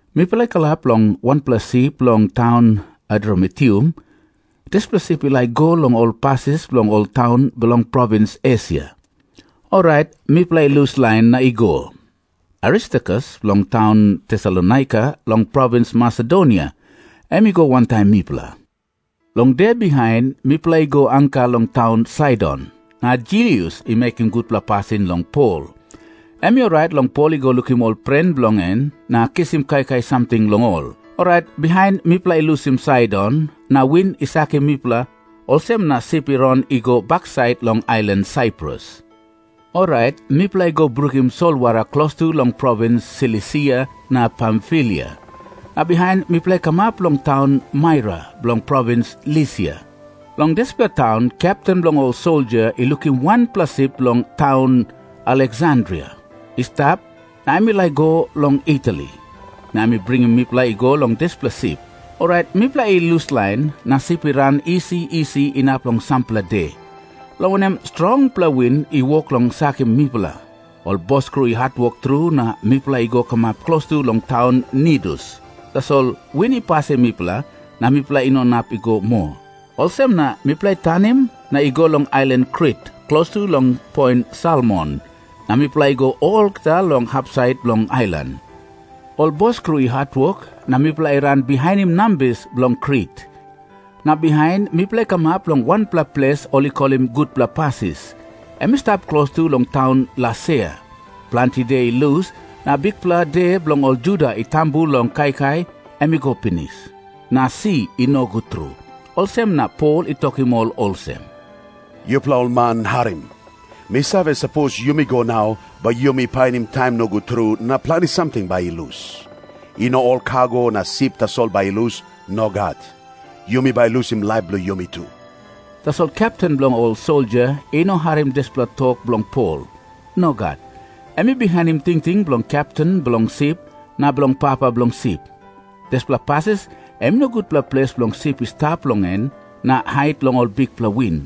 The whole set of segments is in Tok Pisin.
Mipela i kalap long wanpela sip bilong taun Adramitium. Dispela sip i laik i go long ol pasis bilong ol taun bilong provins Esia. Orait mipela i luslain na i go. Aristarkus bilong taun Tesalonaika long provins Masedonia em i go wantaim mipela. Long de bihain mipela i go anka long taun Saidon, na Julius i mekim gutpela pasin long Pol. Em i orait long Pol i go lukim ol pren bilong en na kisim kaikai samting long ol. Orait bihain mipela i lusim Saidon, na win i sakim mipela, olsem na sip i ran i go baksait long ailan Saiprus. Orait mipela i go brukim solwara klostu long provins Silisia na Pamfilia, na bihain mipela i kamap long taun Maira bilong provins Lisia. Long dispela taun kepten bilong ol soldia i lukim wanpela sip bilong taun Aleksandria i stap, na em i laik i go long Itali. Na em i bringim mipela i go long dispela sip. Orait mipela i luslain, na sip i ran isi isi inap long sampela de, long wanem strongpela win i wok long sakim mipela. Ol boskru i hatwok tru na mipela i go kamap klostu long taun Nidus, tasol win i pasim mipela, na mipela i no inap i go moa. Olsem na mipela i tanim na i go long ailan Krit, klostu long poin Salmone, na mipela i go olgeta long hapsait bilong ailan. Ol boskru i hatwok na mipela i ran bihainim nambis bilong Krit. Na bihain mipela i kamap long wanpela ples, ol i kolim Gutpela Pasis, em i stap klostu long taun Lasea. Planti de i lus, na bikpela de bilong ol Juda i tambu long kaikai, em i go pinis. Na si i nogut tru, olsem na Pol i tokim ol olsem, “Yupela ol man, harim. Mi save, sapos yumi go nau, bai yumi painim taim nogut tru, na planti samting bai i lus. I no ol kago na sip tasol bai i lus. Nogat. Yumi bai lusim laip bilong yumi tu.” Tasol kepten bilong ol soldia i no harim dispela tok bilong Pol. Nogat. Em i bihainim tingting bilong kepten bilong sip na bilong papa bilong sip. Dispela pasis em i no gutpela ples bilong sip i stap long en na hait long ol bikpela win.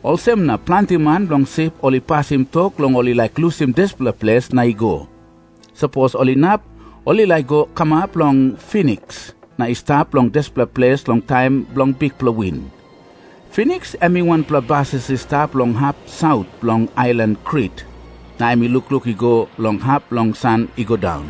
Olsem na planti man long sip ol i pasim tok long ol i laik lusim dispela ples na i go. Sapos ol inap, ol i laik i go kamap long Finiks na i stap long dispela ples long taim bilong bikpela win. Finiks em i wanpela pasis i stap long hap saut bilong ailan Krit, na em i lukluk i go long hap bilong san i go daun.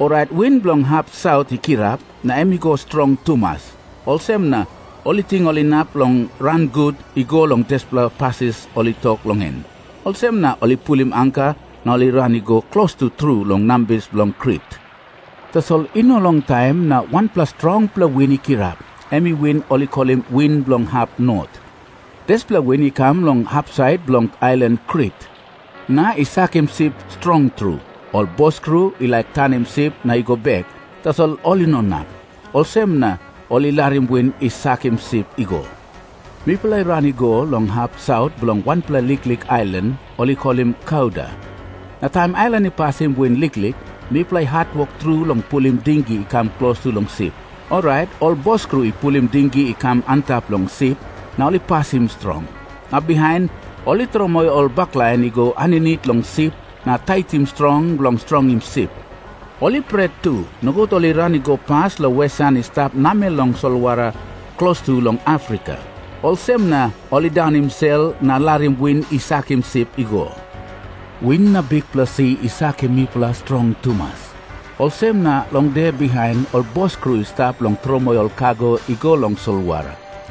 Orait win bilong hap saut i kirap, na em i no strong tumas. Olsem na ol i ting ol inap ran gut i go long dispela pasis ol i toktok long en. Olsem na ol i pulim anka na ol i ran i go klostu tru long nambis bilong Krit. Tasol i no longtaim na wanpela strongpela win i kirap, em win ol i kolim win bilong hap not. Dispela win i kam long hapsait bilong ailan Krit na i sakim sip strong tru. Ol boskru i laik tanim sip na i go bek, tasol ol i no inap. Olsem na ol i larim win i sakim sip i go. Mipela i ran i go long hap saut bilong wanpela liklik ailan, ol i kolim Kauda. Na taim ailan i pasim win liklik, mipela i hatwok tru long pulim dingi i kam klostu long sip. Orait ol boskru i pulim dingi i kam antap long sip na ol i pasim strong. Na bihain ol i tromoi ol baklain i go aninit long sip na taitim strong bilong strongim sip. Ol i pret tu, nogut ol i ran i go pas long wesan i stap namel long solwara klostu long Afrika, olsem na ol i daunim sel na larim win i sakim sip i go. Win na bikpela si i sakim mipela strong tumas, olsem na long de bihain ol boskru i stat long tromoi ol kago i go long solwara.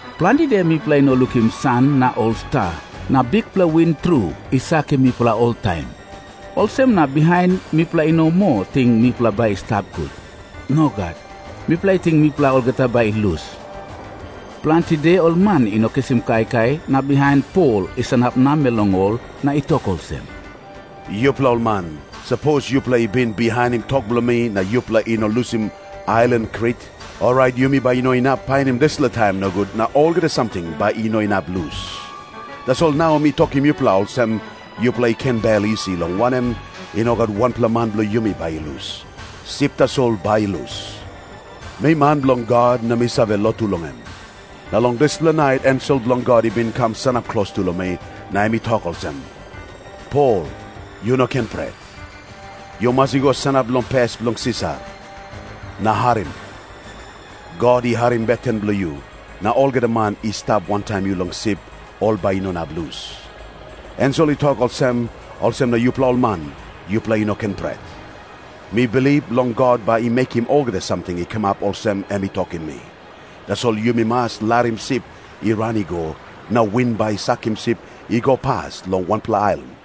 Planti de mipela i no lukim san na ol sta, na bikpela win tru i sakim mipela oltaim. Olsem na bihain mipela i no moa ting mipela bai i stap gut. Nogat. Mipela i ting mipela olgeta bai i lus. Planti de ol man i no kisim kaikai, na bihain Pol i sanap namel long ol na i tok olsem, “Yupela ol man, sapos yupela i bin bihainim tok bilong mi na yupela i no lusim ailan Krit, orait yumi bai i no inap painim dispela taim nogut, na olgeta samting bai i no inap lus. Tasol nau mi tokim yupela olsem, yupela i ken bel isi, long wanem, i no gat wanpela man bilong yumi bai i lus. Sip tasol bai i lus. Mi man bilong God, na mi save lotu long em. Na long dispela nait ensel bilong God i bin kam sanap klostu long mi, na em i tok olsem, ‘Pol, yu no ken pret. Yu mas i go sanap long pes bilong Sisar. Na harim. God i harim beten bilong yu, na olgeta man i stap wantaim yu long sip, ol bai i no inap lus.’ Ensel i tok olsem, olsem na yupela ol man, yupela i no ken pret. Mi bilip long God bai i mekim olgeta samting i kamap olsem em i tokim mi. Tasol yumi mas larim sip i ran i go, na win bai i sakim sip i go pas long wanpela ailan.”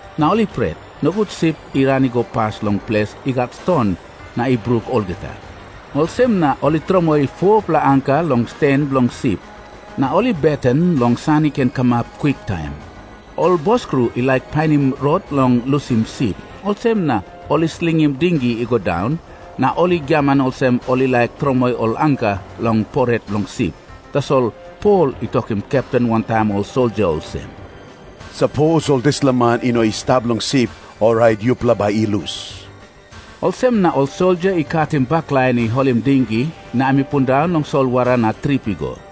Na ol i pret, nogut sip i ran i go pas long ples i gat ston na i bruk olgeta. Olsem na ol i tromoi 4-pela anka long stan bilong sip. Na ol i beten long san i ken kamap kwiktaim. Ol boskru i laik painim rot bilong lusim sip. Olsem na ol i slingim dingi i go daun, na ol i giaman olsem ol i laik tromoi ol anka long poret bilong sip. Tasol Pol i tokim kepten wantaim ol soldia olsem, “Sapos ol dispela man i no i stap long sip, orait yupela bai i lus.” Olsem na ol soldia i katim baklain i holim dingi na em i pundaun long solwara na trip i go.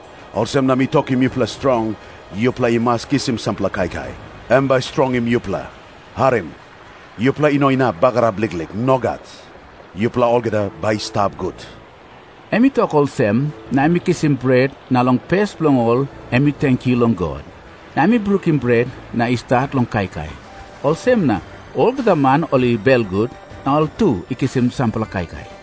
Olsem na mi tokim yupela strong, yupela i mas kisim sampela kaikai. Em bai i strongim yupela. Harim. Yupela i no inap bagarap liklik. Nogat. Yupela olgeta bai i stap gut.” Em i tok olsem, na em i kisim bret na long pes bilong ol em i tenkyu long God. Na em i brukim bret na i stat long kaikai. Olsem na olgeta man ol i belgut, na ol tu i kisim sampela kaikai.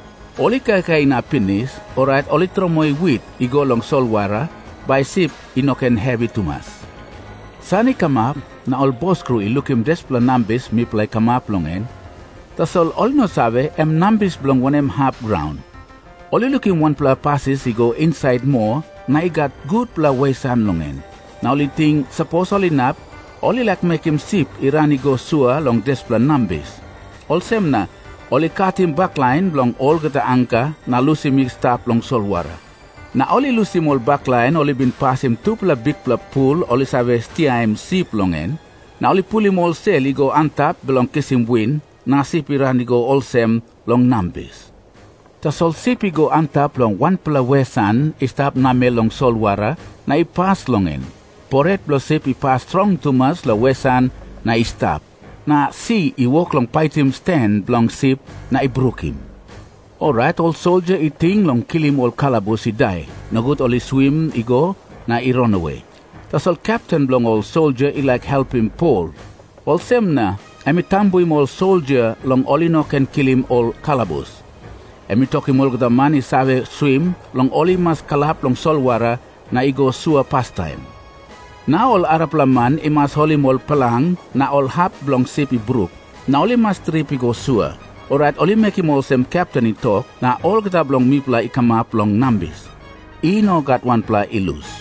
Ol i kaikai inap pinis, orait ol i tromoi wit i go long solwara, bai sip i no ken hevi tumas. San i kamap, na ol boskru i lukim dispela nambis mipela i kamap long en, tasol ol i no save, em nambis bilong wanem hap graun. Ol i lukim wanpela pasis i go insait moa na i gat gutpela wesan long en. Na ol i ting, sapos ol inap, ol i laik mekim sip i ran i go sua long dispela nambis. Olsem na ol i katim baklain bilong olgeta anka na lusim i stap long solwara. Na ol i lusim ol baklain ol i bin pasim tupela bikpela pul ol i save stiaim sip long en. Na ol i pulim ol sel i go antap bilong kisim win, na sip i ran i go olsem long nambis. Tasol sip i go antap long wanpela wesan i stap namel long solwara, na i pas long en. Poret bilong sip i pas strong tumas long wesan na i stap. Na si i wok long paitim stan bilong sip na i brukim. Orait ol soldia i ting long kilim ol kalabus i dai, nogut ol i swim i go na i ranawe. Tasol kepten bilong ol soldia i laik helpim Pol, olsem na em i tambuim ol soldia long ol i no ken kilim ol kalabus. Em i tokim olgeta man i save swim, long ol i mas kalap long solwara na i go sua pastaim. Na ol arapela man i mas holim ol plang na ol hap bilong sip i bruk, na ol i mas trip i go sua. Orait ol i mekim olsem kepten i tok, na olgeta bilong mipela i kamap long nambis. I no gat wanpela i lus.